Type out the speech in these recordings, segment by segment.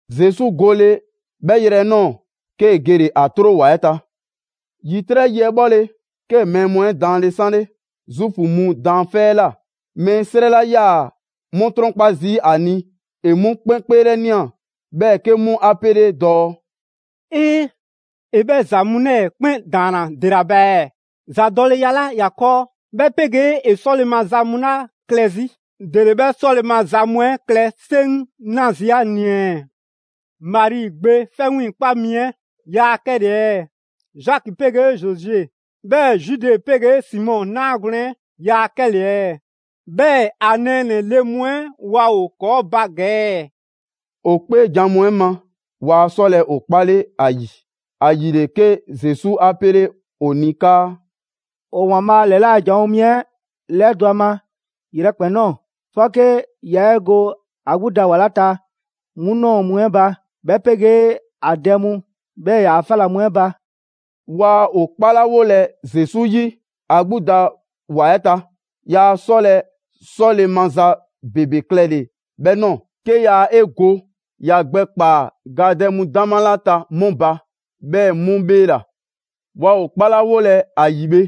Zesu gole 'bhɛ yrɛ 'ɛ 'nɔɔ‑, 'kee‑ gele‑ ‑a 'tro ‑wa 'ɛ ta. ‑Yitrɛ' yi 'ɛ 'bhɔle‑, 'kee‑ mɛɛ mu 'ɛ daanle 'sanle Zuufu mu daanfɛ' 'ɛ ꞊la. Mɛɛ 'srɛ 'la 'yaa‑ 'mu 'trɔnkpa zii' ‑a ni, ‑e 'mu 'kpɛn 'kpeelɛnia, 'bhɛɛ‑ 'ke 'mu 'a 'pele dɔɔ: «'Ee! ‑E 'bhɛ ‑za mu 'lɛɛ‑ 'kpɛn ‑daanna ‑dela ba ɛɛ? ‑Zadɔleya 'la ‑ya 'kɔɔ, 'bhɛ 'pegee ‑e 'sɔle‑ maza mu 'la klɛ 'zi, ‑dele 'bhɛ 'sɔle‑ maza mu 'ɛ klɛ 'seŋ 'na zii' ‑a ni ɛɛ? Mari gbe 'fɛ 'wiiŋkpa mi 'ɛ yaa 'kɛle‑ ɛɛ? Zaki 'pegee Zose, 'bhɛɛ‑ Zude 'pegee Simɔ 'naagwlɛn‑ 'ɛ ‑yaa 'kɛle‑ ɛɛ? 'Bhɛɛ‑ ‑a nɛɛnɛ‑ le mu 'ɛ waa ‑o 'kɔɔ ba ‑gɛ ɛɛ?» ‑O 'kpeejan‑ mu 'ɛ ma, waa 'sɔlɛ‑ ‑o 'kpale ‑a ‑yi. ‑Ayile, 'ke Zesu 'a 'pele ‑o ni 'kaa: «‑O ‑Waanbhaa' ‑lɛla' janwo mi 'ɛ ‑lɛdɔ' a ma yrɛkpɛn‑ ꞊nɔɔ, 'fɔke ya 'e go ‑a 'gbu da ‑wa 'la ta 'mu ꞊nɔɔ mu 'ɛ ba, 'bhɛ 'pegee ‑a dɛ mu, 'bhɛɛ‑ ‑yaa' 'fa ‑la mu 'ɛ ba.» Waa ‑o 'kpalawolɛ Zesu 'yi ‑a 'gbu da ‑wa 'ɛ ta, yaa 'sɔlɛ‑ 'sɔle‑ maza ‑bebe klɛlɛ 'bhɛ ꞊nɔɔ; 'ke yaa 'e go ‑ya gbɛ ‑kpaa gadɛ mu 'dama 'la ta 'mu ba, 'bhɛɛ‑ 'mu 'bheela‑. Waa ‑o 'kpalawolɛ ‑a ‑yi bhe,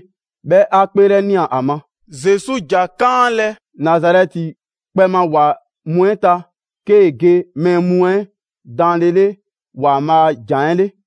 'bhɛ 'a 'kpeelɛnia ‑a ma. Zesu ‑ja 'kaanlɛ‑ Nazarɛti kpɛ ma ‑wa mu 'ɛ ta 'kee‑ ge mɛɛ mu 'ɛ daanlele ‑Waanbhaa' a ‑jan 'ɛ 'le.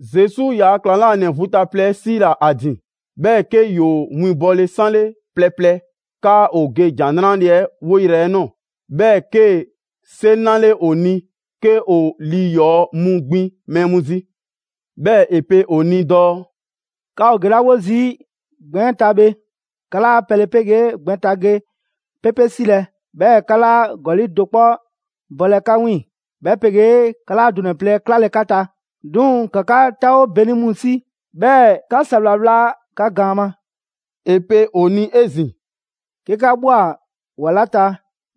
Zesu ‑yaa' ‑klaŋlanɛ vu ta plɛ 'ɛ 'siila‑ ‑a ‑din, 'bhɛɛ‑ 'ke ‑yoo winbɔle 'sanle plɛ plɛ 'kaa ‑o ge ‑Jan 'Nrale‑ 'ɛ 'woyrɛ‑ 'ɛ nɔɔ‑; 'bhɛɛ‑ 'kee‑ 'seŋ 'nale ‑o ni 'ke ‑o lii ‑yɔɔ' mu ‑gbin mɛɛ mu zi. 'Bhɛɛ‑ ‑e pe ‑o ni dɔɔ: «'Ka ‑o gelawo zii' gbɛn 'ɛ ta bhe, 'ka 'laa pɛle 'pegee gbɛn ta ge 'pepe 'silɛ‑, 'bhɛɛ‑ 'ka 'laa ‑gɔli' do 'kpɔ bɔlɛ 'ka 'wiiŋ‑, 'bhɛ 'pegee 'ka 'laa dunɛ‑ plɛ 'klalɛ‑ 'ka ta. 'Duŋ‑ ‑ka 'ka 'taawo 'beni mu 'si, 'bhɛɛ‑ ‑ka ‑sawla 'wla 'ka gaan ma.» ‑E pe ‑o ni 'ezin‑: «'Ke 'ka ꞊bhwa ‑wa 'la ta,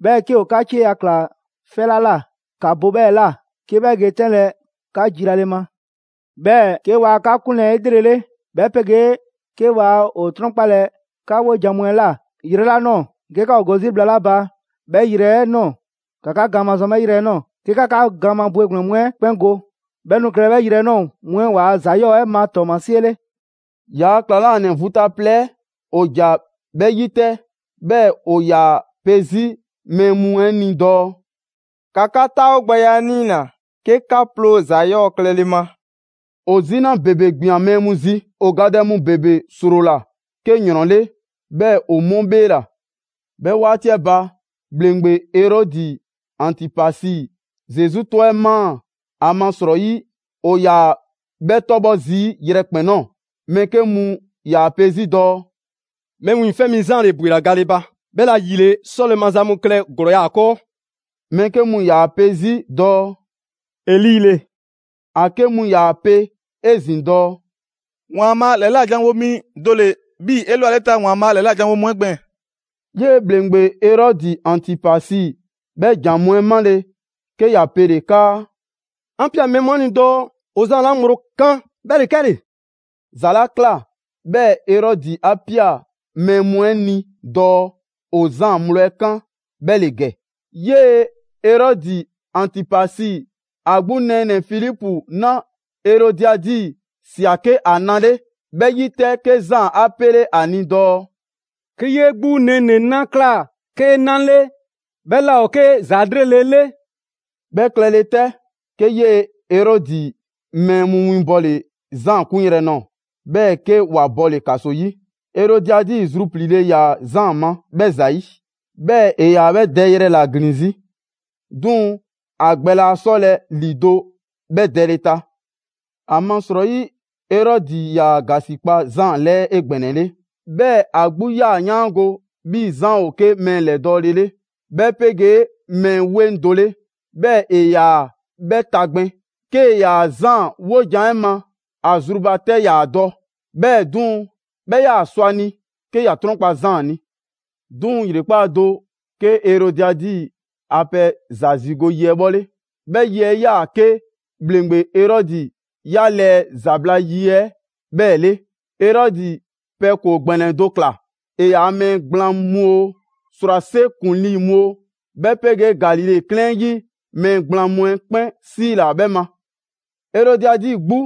'bhɛɛ‑ 'ke ‑o 'ka 'cieya‑ ꞊kla 'fɛ 'la ꞊la, ‑ka bo 'bhɛɛ‑ ꞊la, 'ke 'bhɛ ge 'tɛnlɛ‑ 'ka jilale ma. 'Bhɛɛ‑ 'ke waa 'ka 'kunlɛ‑ 'elrele, 'bhɛ 'pegee 'ke waa ‑o 'trɔnkpalɛ 'ka 'wojan‑ mu 'ɛ ꞊la yrɛ 'la ꞊nɔɔ, 'ke 'ka ‑o go 'zi bhla 'la ba 'bhɛ yrɛ 'ɛ 'nɔɔ‑, ‑ka 'ka gaan mazɔn 'bhɛ yrɛ 'ɛ ꞊nɔɔ, 'ke 'ka 'ka gaan ma bwegblɛn‑ mu 'ɛ 'kpɛn go. 'Bhɛ nu klɛlɛ 'bhɛ yrɛ 'ɛ ꞊nɔɔ mu 'ɛ ‑waa' ‑za 'yɔɔ‑ 'ɛ ma 'tɔɔmasie 'le.» ‑Yaa' ‑klaŋlanɛ vu ta plɛ 'ɛ ‑o ‑ja 'bhɛɛ‑ 'yi 'tɛ, 'bhɛɛ‑ ‑o ‑yaa pe 'zi mɛɛ mu 'ɛ ni dɔɔ: «‑Ka 'ka 'taawogbɛya 'ɛ 'niina‑ 'ke 'ka 'ploo‑ ‑za 'yɔɔ‑ klɛle ma!» ‑O 'zina ‑bebe ꞊gbian mɛɛ mu zi. ‑O gadɛ mu ‑bebe 'srola‑ 'ke ‑yrɔn 'le, 'bhɛɛ‑ ‑o 'mu 'bheela‑. 'Bhɛ 'waati 'ɛ ba, ‑Bhleŋgbe Erɔdi Antipasi Zesu 'tɔ 'ɛ ꞊maa, ‑amasrɔyi ‑o ‑yaa 'bhɛ 'tɔbhɔ zii' yrɛkpɛn‑ ꞊nɔɔ. Mɛɛ 'ke mu ‑yaa pe 'zi dɔɔ: «Mɛɛ Wiiŋfɛ' Mi Zaan ‑le ‑bwela gale ba, 'bhɛla‑ ‑yile 'sɔle‑ maza mu klɛ ‑glɔɔya' ‑o ‑a 'kɔɔ.» Mɛɛ 'ke mu ‑yaa 'pe zi dɔɔ: «Eli ‑le». ‑A 'ke mu ‑yaa 'pe 'ezin‑ dɔɔ: «‑Waanbhaa' ‑lɛla' janwo mi do ‑le 'bhii‑ 'elwaleta ‑Waanbhaa' ‑lɛla' ‑janwo' mu 'ɛ gbɛɛn‑.» 'Yee‑ ‑bhleŋgbe Erɔdi Antipasi 'bhɛ ‑jan mu 'ɛ 'male‑, 'ke ‑ya pele‑ 'kaa: «'An ꞊pia mɛɛ mu 'ɛ ni dɔɔ ‑o Zaan 'la ŋgblo 'kan, 'bhɛ ‑le 'kɛle‑». ‑Za 'la ꞊kla 'bhɛɛ‑ Erɔdi 'a ꞊pia mɛɛ mu 'ɛ ni dɔɔ ‑o Zaan ŋgblo 'ɛ kan' 'bhɛ ‑le ‑gɛ: 'Yee‑ Erɔdi Antipasi ‑a 'gbu nɛɛnɛ‑ Filipu 'na Erodiadi ꞊sia 'ke ‑a na 'le. 'Bhɛ 'yi 'tɛ, 'ke Zaan 'a 'pele ‑a ni dɔɔ: «'Ke 'yee 'gbu nɛɛnɛ‑ na ꞊kla 'kee 'na 'le, 'bhɛ 'laa ‑o 'ke ‑za 'lrele‑ 'le.» 'Bhɛ klɛle 'tɛ, 'ke 'yee‑ Erɔdi mɛɛ mu winbɔle Zaan 'kunyrɛ‑ nɔɔ‑, 'bhɛɛ‑ 'ke ‑wa bɔle‑ ‑kaso 'yi. Erodiadi zrupliile ‑yaa Zaan ma 'bhɛ ‑zayi', 'bhɛɛ‑ ‑e ‑yaa 'bhɛ dɛyrɛ ‑la ‑glin 'zi, 'duŋ‑ ‑a gbɛ laa 'sɔlɛ‑ ‑lido' 'bhɛ dɛle ta. ‑Amasrɔyi Erɔdi ‑yaa ‑gasikpa Zaan 'lɛɛ 'egbɛnɛle. 'Bhɛɛ‑ ‑a 'gbu 'yaa‑ 'yaango‑ 'bhii‑ Zaan ‑o 'ke mɛɛ ‑lɛdɔɔle 'le, 'bhɛ 'pegee mɛɛ 'weŋ do 'le, 'bhɛɛ‑ ‑e ‑yaa 'bhɛ tagbin. 'Kee‑ ‑yaa Zaan 'wojan‑ 'ɛ ma, ‑a zru ba 'tɛ 'yaa‑ dɔ. 'Bhɛɛ‑ 'duŋ‑, 'bhɛ 'yaa‑ sɔ ‑a ni 'ke ‑ya 'trɔnkpa‑ Zaan ni. 'Duŋ‑ ‑yrekpaa' do, 'ke Erodiadi ‑a pɛ ‑za ‑zigo' yi 'ɛ 'bhɔle. 'Bhɛ yi 'ɛ 'yaa‑ 'ke ‑bhleŋgbe Erɔdi 'ya lɛɛ ‑zabla' yi 'ɛ 'bhɛɛ‑ 'le. Erɔdi pɛ ‑koo ‑gbɛnɛ do ꞊kla. ‑E ‑yaa' mɛɛ gblaan mu oo, ‑srwase' ‑kuŋlii mu oo, 'bhɛ 'pegee Galile 'klɛɛn 'ɛ 'yi mɛɛ gblaan mu 'ɛ 'kpɛn 'siila‑ 'bhɛ ma. Erodiadi 'gbu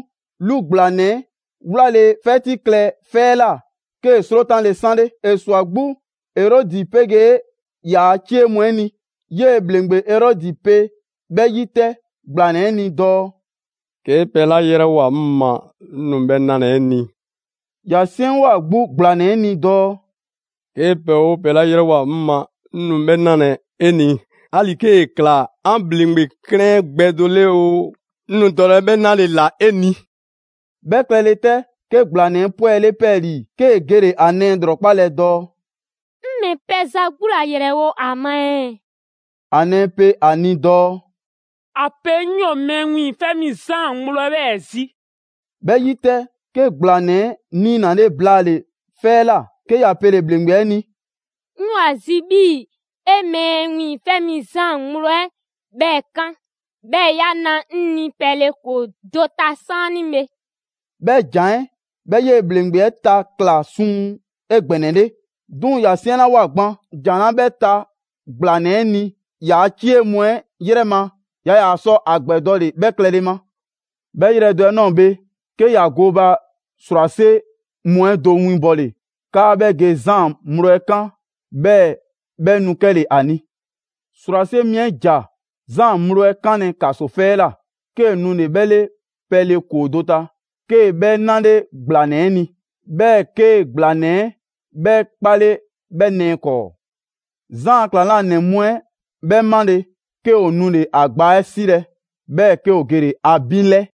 'lu ‑gblanɛ 'ɛ 'wlale‑ 'fɛti klɛ 'fɛ 'ɛ ꞊la, 'kee‑ 'srotanle 'sanle. ‑E ꞊swa 'gbu Erɔdi 'pegee ‑yaa' 'cie mu 'ɛ ni. 'Yee‑ ‑bhleŋgbe Erɔdi pe 'bhɛ 'yi 'tɛ gblanɛ 'ɛ ni dɔɔ: «'Kee pɛ 'la 'yrɛwoa‑ 'ŋ ma, 'ŋ nu 'bhɛɛ‑ 'nalɛ‑ 'e ni.» ‑Ya 'siɛnwoa‑ 'gbu ‑gblanɛ 'ɛ ni dɔɔ: «'Kee pɛ 'oo pɛ 'la 'yrɛwoa‑ 'ŋ ma, 'ŋ nu 'bhɛ 'nalɛ‑ 'e ni, 'ali‑ 'kee‑ ꞊kla 'an ‑bhleŋgbe 'klɛɛn 'ɛ gbɛ do 'le oo, 'ŋ nu dɔlɛ 'bhɛ 'nale‑ ꞊la 'e ni.» 'Bhɛ klɛle 'tɛ, 'ke ‑gblanɛ 'ɛ 'pwɛle 'pɛɛlii‑, 'kee‑ gele‑ ‑a nɛɛ ‑lrɔkpalɛ dɔɔ: «'Ŋ ‑mɛ pɛ ‑za 'gbu ‑la 'yrɛwo ‑a ma ɛɛ?» ‑A nɛɛ pe a ni dɔɔ: «‑A pe 'ŋ 'yoo‑ Mɛɛ Wiiŋfɛ' Mi Zaan ŋgblo 'ɛ 'bhɛɛ‑ zi.» 'Bhɛ 'yi 'tɛ, 'ke ‑gblanɛ 'ɛ 'niinale blaale‑ 'fɛ 'ɛ ꞊la, 'ke ‑ya pele‑ ‑bhleŋgbe 'ɛ ni: «'Ŋ 'yoo‑ ‑a zi 'bhii‑ 'e Mɛɛ Wiiŋfɛ' Mi Zaan ŋgblo 'ɛ 'bhɛɛ‑ 'kan, 'bhɛɛ‑ 'ya na 'ŋ ni pɛle ‑koo do ta 'saanibhe.» 'Bhɛ ‑jan 'ɛ 'bhɛ 'yee‑ ‑bhleŋgbe 'ɛ ta ꞊kla suŋ 'egbɛnɛle. 'Duŋ‑ ‑ya 'siɛnlawoa gban ‑jan 'la 'bhɛ ta ‑gblanɛ 'ɛ ni, yaa 'cie mu 'ɛ 'yrɛ ma, yaa ‑yaa sɔ a ‑gbɛdɔle 'bhɛ klɛle ma. 'Bhɛ yrɛ do 'ɛ ꞊nɔɔ bhe, 'ke ‑ya gooba ‑srwase' mu 'ɛ do winbɔle 'kaa 'bhɛ ge Zaan ŋgblo 'ɛ 'kan, 'bhɛɛ‑ 'bhɛ nu 'kɛle‑ ‑a ni. ‑Srwase' mi 'ɛ ‑ja Zaan ŋgblo 'ɛ 'kanlɛ‑ ‑kaso 'fɛ 'ɛ ꞊la, 'kee‑ nule‑ 'bhɛ 'le pɛle ‑koo do ta. 'Kee‑ 'bhɛ 'nale ‑gblanɛ 'ɛ ni. 'Bhɛɛ‑ 'ke ‑gblanɛ 'ɛ 'bhɛ 'kpale 'bhɛ nɛɛ 'kɔɔ. Zaan ‑a ‑klaŋlanɛ mu 'ɛ 'bhɛ 'male‑, 'ke ‑o nule‑ ‑a gbaa 'ɛ 'silɛ‑, 'bhɛɛ‑ 'ke ‑o gele‑ ‑a binlɛ.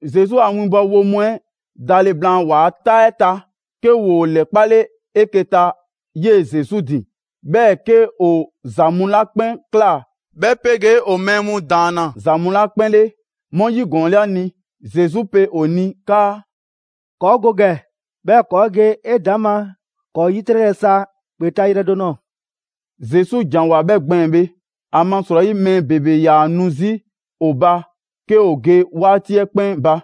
Zesu a winbɔwo mu 'ɛ dale blaan ‑waa' 'taa 'ɛ ta, 'ke ‑woo ‑lɛkpale 'eke‑ ta 'yee‑ Zesu ‑din, 'bhɛɛ‑ 'ke ‑o ‑za mu 'la 'kpɛn ꞊kla 'bhɛ 'pegee ‑o mɛɛ mu ‑daanna ‑za mu 'la 'kpɛn 'le, 'mu 'yigɔɔnle ‑a ni. Zesu pe ‑o ni 'kaa: «‑Kɔɔ' go ‑gɛ, 'bhɛɛ‑ ‑kɔɔ' ge 'edaŋma ‑kɔɔ' 'yitrɛlɛ sa ‑kpe ta yrɛ do ꞊nɔɔ.» Zesu ‑janwoa 'bhɛ gbɛɛn‑ bhe, ‑amasrɔyi mɛɛ ‑bebe 'yaa‑ nu 'zi ‑o ba 'ke ‑o ge 'waati 'ɛ 'kpɛn ba,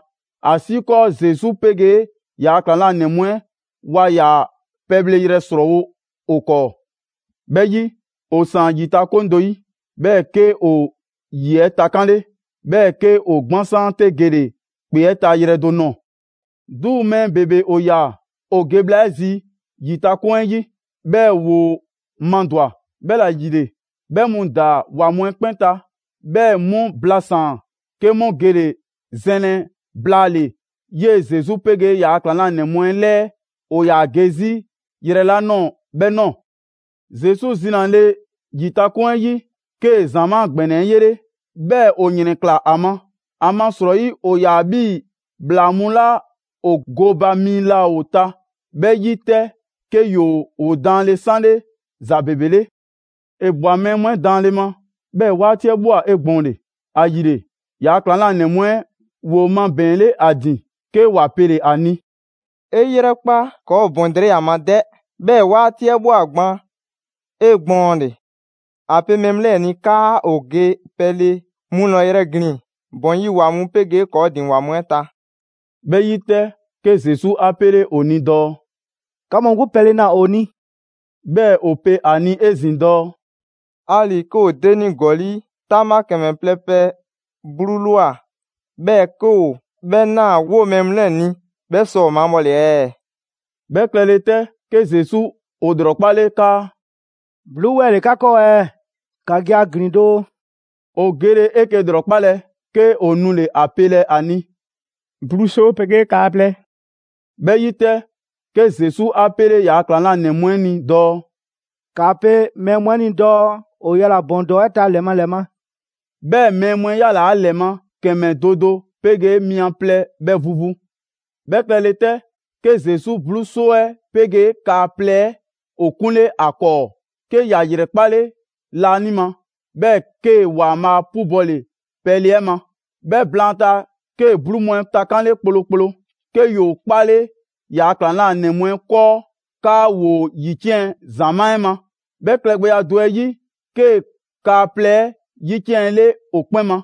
‑asiikɔɔ Zesu 'pegee ‑yaa' ‑klaŋlanɛ mu 'ɛ waa ‑yaa pɛbhleyrɛ ‑srɔɔwo ‑o 'kɔɔ. 'Bhɛ 'yi, ‑O ‑saan ‑yitakoŋ do 'yi, 'bhɛɛ‑ 'ke ‑o ‑yi 'ɛ takanle, 'bhɛɛ‑ 'ke ‑o 'gbansaan 'te gele‑ ‑kpe 'ɛ ta yrɛ do ꞊nɔɔ. 'Duŋ‑ mɛɛ ‑bebe ‑o ꞊ya, ‑o ge bhla 'ɛ zi ‑yitakoŋ 'ɛ 'yi, 'bhɛɛ‑ ‑woo madwa‑. 'Bhɛla‑ ‑yile, 'bhɛ mu ‑daa ‑wa mu 'ɛ 'kpɛn ta, 'bhɛɛ‑ 'mu blasaan‑, 'ke 'mu gele‑ zɛnlɛ blaale‑ 'yee‑ Zesu 'pegee ‑yaa' ‑klaŋlanɛ mu 'ɛ 'lɛɛ ‑o ‑yaa ge 'zi yrɛ 'la ꞊nɔɔ 'bhɛ ꞊nɔɔ. Zesu zinale ‑yitakoŋ 'ɛ 'yi, 'kee‑ ‑zamaa' ‑gbɛnɛ 'ɛ yele‑. 'Bhɛɛ‑ ‑o ‑yrɛnklaa ‑a ma. ‑Amasrɔyi ‑o ‑yaa 'bhii‑ ‑bhlaa mu 'la ‑o gooba mi laa ‑o ta. 'Bhɛ 'yi 'tɛ, 'ke ‑yoo ‑o daanle 'sanle ‑za ‑bebe 'le. ‑E ꞊bwa mɛɛ mu 'ɛ daanle ma, 'bhɛɛ‑ 'waati 'ɛ ꞊bhwa 'egbɔɔnle. ‑Ayile, ‑yaa' ‑klaŋlanɛ mu 'ɛ ‑woo mabɛɛnle ‑a ‑din, 'ke ‑wa pele‑ ‑a ni: «'E 'yrɛkpa, ‑kɔɔ' ‑o ‑bɔn drɛyi' ‑a ma 'dɛ! 'Bhɛɛ‑ 'waati 'ɛ ꞊bhwa gban 'egbɔɔnle; ‑a pe mɛɛ mu 'lɛɛ‑ ni 'kaa ‑o ge pɛle mu ‑lɔyrɛ' ‑glin ‑bɔn 'yi ‑wa mu 'pegee ‑kɔɔ' ‑din ‑wa mu 'ɛ ta.» 'Bhɛ 'yi 'tɛ, 'ke Zesu 'a pele ‑o ni dɔɔ: «'Ka mu 'gbu pɛle na ‑o ni!» 'Bhɛɛ‑ ‑o pe ‑a ni 'ezin‑ dɔɔ: «'Ali‑ 'ke 'o denie ‑gɔli' 'taŋbha ‑kɛmɛ plɛ pɛ 'bluu ꞊lwa, 'bhɛɛ‑ 'ke 'o 'bhɛ ꞊naa 'woo‑ mɛɛ mu 'lɛɛ‑ ni, 'bhɛ sɔ ‑o mabhɔle ɛɛ?» 'Bhɛ klɛle 'tɛ, 'ke Zesu ‑o ‑lrɔkpale 'kaa: «'bluu 'wɛɛ‑ ‑le 'ka 'kɔɔ ɛɛ? ‑Ka ge ‑a ‑glin doo.» ‑O gele 'eke‑ ‑lrɔkpalɛ 'ke ‑o nule‑ ‑a pelɛ ‑a ni: «'bluu 'soo 'pegee kaa plɛ.» 'Bhɛ 'yi 'tɛ, 'ke Zesu 'a 'pele ‑yaa' ‑klaŋlanɛ mu 'ɛ ni dɔɔ: «‑Kaa pe mɛɛ mu 'ɛ ni dɔɔ ‑o yala‑ ‑bɔn ‑dɔɔ 'ɛ ta ‑lɛ ma ‑lɛ ma!» 'Bhɛɛ‑ mɛɛ mu 'ɛ ‑yalaa' ‑lɛ ma ‑kɛmɛ do do 'pegee mia plɛ bhɛ vu vu. 'Bhɛ klɛle 'tɛ, 'ke Zesu 'bluu 'soo 'ɛ 'pegee kaa plɛ ‑o 'kunle ‑a 'kɔɔ, 'ke ‑ya ‑yrɛ 'kpale laanima, 'bhɛɛ‑ 'kee‑ ‑Waanbhaa' 'pubɔle pɛle 'ɛ ma. 'Bhɛ blaanta, 'kee‑ 'bluu mu 'ɛ takanle kplokplo, 'ke ‑yoo 'kpale ‑yaa' ‑klaŋlanɛ mu 'ɛ 'kɔɔ 'kaa ‑woo ‑yiciɛn' ‑zamaa' 'ɛ ma. 'Bhɛ klɛgbɛya do 'ɛ yi, 'kee‑ kaa plɛ 'ɛ 'yiciɛnle ‑o 'kpɛn ma.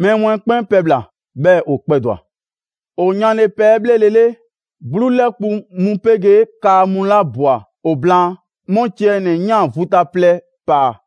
Mɛɛ mu 'ɛ 'kpɛn pɛbhla‑, 'bhɛɛ‑ ‑o kpɛdwa‑. ‑O yanle pɛ 'ɛ 'bhlelele, 'bluu 'lɛkpu‑ mu 'pegee kaa mu 'la ꞊bwa ‑o blaan, 'mu ciɛ ‑nɛ ꞊yan vu ta plɛ ‑paa.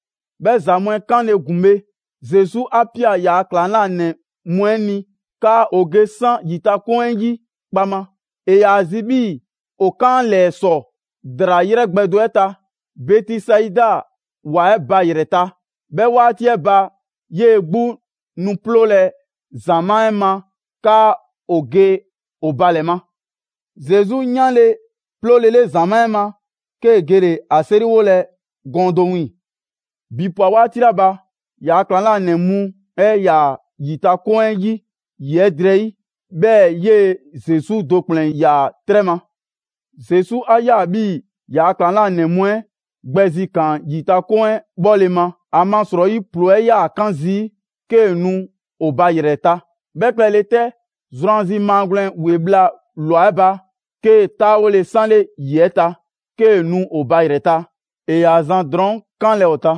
'Bhɛ ‑za mu 'ɛ 'kanle‑ ‑gun bhe, Zesu 'a ꞊pia ‑yaa' ‑klaŋlanɛ mu 'ɛ ni 'kaa ‑o ge 'san ‑yitakoŋ 'ɛ 'yi kpaŋma. ‑E ‑yaa zi 'bhii‑ ‑o 'kan 'a ‑lɛɛ ‑sɔ ‑draa 'yrɛ gbɛ do 'ɛ ta, Bɛtisaida ‑wa 'ɛ ba ‑yrɛ 'ɛ ta. 'Bhɛ 'waati 'ɛ ba, 'yee‑ 'gbu nu 'ploolɛ‑ ‑zamaa' 'ɛ ma 'kaa ‑o ge ‑o ba ‑lɛ ma. Zesu 'yanle‑ 'ploolele ‑zamaa' 'ɛ ma, 'kee‑ gele‑ ‑a 'seriwolɛ gɔɔn do wiiŋ‑. ‑Bi ꞊pwa 'waati 'la ba, ‑yaa' ‑klaŋlanɛ mu 'ɛ 'yaa‑ ‑yitakoŋ 'ɛ 'yi, ‑yi 'ɛ drɛyi', 'bhɛɛ‑ 'yee‑ Zesu do ‑kplɛn ‑yaa 'trɛ ma. Zesu 'a ꞊ya 'bhii ‑yaa ‑klaŋlanɛ mu 'ɛ gbɛzikaan ‑yitakoŋ 'ɛ 'bhɔle‑ ma, ‑amasrɔyi ‑ploo 'ɛ 'yaa‑ 'kan zii' 'kee‑ nu ‑o ba ‑yrɛ ta. 'Bhɛ klɛle 'tɛ, zrwanzi maa gwlɛn ‑we bhla ꞊lwa 'ɛ ba, 'kee‑ 'taawole 'sanle ‑yi 'ɛ ta 'kee‑ nu ‑o ba ‑yrɛ ta, ‑e ‑yaa zan drɔɔn' 'kanlɛ‑ ‑o ta.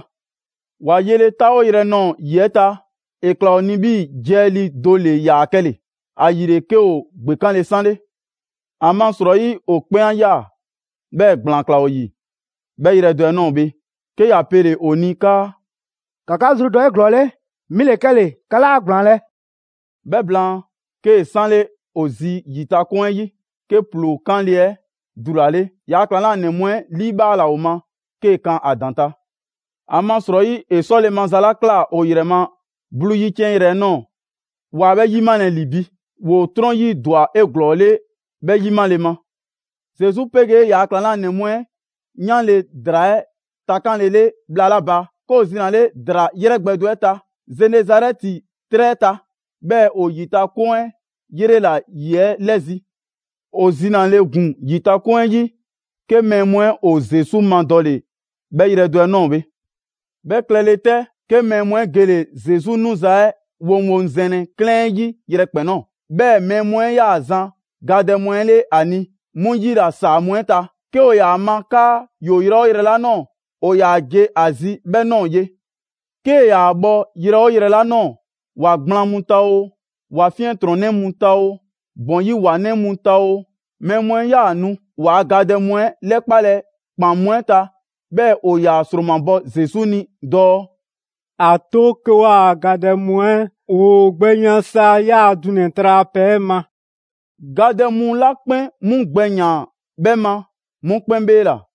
‑Wa yele 'taawoyrɛ 'ɛ ꞊nɔɔ ‑yi 'ɛ ta, ‑e ꞊kla ‑o ni 'bhii‑ jiɛlii do ‑le ‑yaa 'kɛle‑, ‑ayile 'ke ‑o ‑gbekanle 'sanle. ‑Amasrɔyi, ‑o 'kpɛn 'a ꞊ya, 'bhɛɛ‑ ‑gblaan ꞊klaa ‑o ‑yi. 'Bhɛ yrɛ do 'ɛ ꞊nɔɔ bhe, 'ke ‑ya pele‑ ‑o ni 'kaa: «‑Ka 'ka zrudɔ 'eglɔɔle, 'mi ‑le 'kɛle‑, 'ka 'laa ‑gblaanlɛ'.» 'Bhɛ blaan, 'kee‑ 'sanle ‑o zi ‑yitakoŋ 'ɛ 'yi, 'ke ‑ploo 'kanle‑ 'ɛ dulale. ‑Yaa' ‑klaŋlanɛ mu 'ɛ 'liibhaala ‑o ma 'kee‑ kan ‑a ‑daŋ' ta. ‑Amasrɔyi, ‑e 'sɔle‑ maza 'la ꞊kla ‑o ‑yrɛ ma 'bluu 'yiciɛnyrɛ 'ɛ ꞊nɔɔ, ‑waa 'bhɛ ‑yi 'malɛ‑ ‑li bi, ‑woo 'trɔn 'yi ‑dwa 'eglɔɔle 'bhɛ 'yimale ma. Zesu 'pegee ‑yaa' ‑klaŋlanɛ mu 'ɛ 'yanle ‑draa 'ɛ takanlele bhla 'la ba, 'ke ‑o zinale ‑draa ‑yrɛ gbɛ do 'ɛ ta Zenezarɛti 'trɛ 'ɛ ta, 'bhɛɛ‑ ‑o ‑yitakoŋ 'ɛ 'yrela‑ ‑yi 'ɛ 'lɛzi‑. ‑O zinale ‑gun ‑yitakoŋ 'ɛ 'yi, 'ke mɛɛ mu 'ɛ ‑o Zesu madɔle 'bhɛ yrɛ do 'ɛ ꞊nɔɔ bhe. 'Bhɛ klɛle 'tɛ, 'ke mɛɛ mu 'ɛ gele‑ Zesu 'nuza‑ 'ɛ woŋwoŋzɛnlɛ 'klɛɛn 'ɛ 'yi yrɛkpɛn‑ ꞊nɔɔ. 'Bhɛɛ‑ mɛɛ mu 'ɛ 'yaa‑ zan gadɛ mu 'ɛ 'le ‑a ni 'mu 'yila ‑saa mu 'ɛ ta. 'Ke ‑o ‑yaa ma 'kaa ‑yoo yrɛ 'oo yrɛ 'la ꞊nɔɔ, ‑o ‑yaa ge ‑a zi 'bhɛɛ‑ ꞊nɔɔ ye. 'Kee‑ ‑yaa bhɔ yrɛ 'oo yrɛ 'la ꞊nɔɔ, ‑wa gblaan mu ta oo, ‑wa 'fiɛntrɔnnɛ mu ta oo, ‑bɔn 'yi ‑wanɛ' mu ta oo, mɛɛ mu 'ɛ 'yaa‑ nu ‑waa' gadɛ mu 'ɛ 'lɛkpalɛ ‑kpan mu 'ɛ ta, 'bhɛɛ‑ ‑o ‑yaa ‑sromabɔ Zesu ni dɔɔ: «‑A 'to 'ke 'waa‑ gadɛ mu 'ɛ ‑woo gbɛ yan sa ‑yaa' dunɛ‑ tralapɛ 'ɛ ma.» Gadɛ mu 'la 'kpɛn 'mu gbɛ ‑yaan 'bhɛ ma, 'mu 'kpɛn 'bheela‑.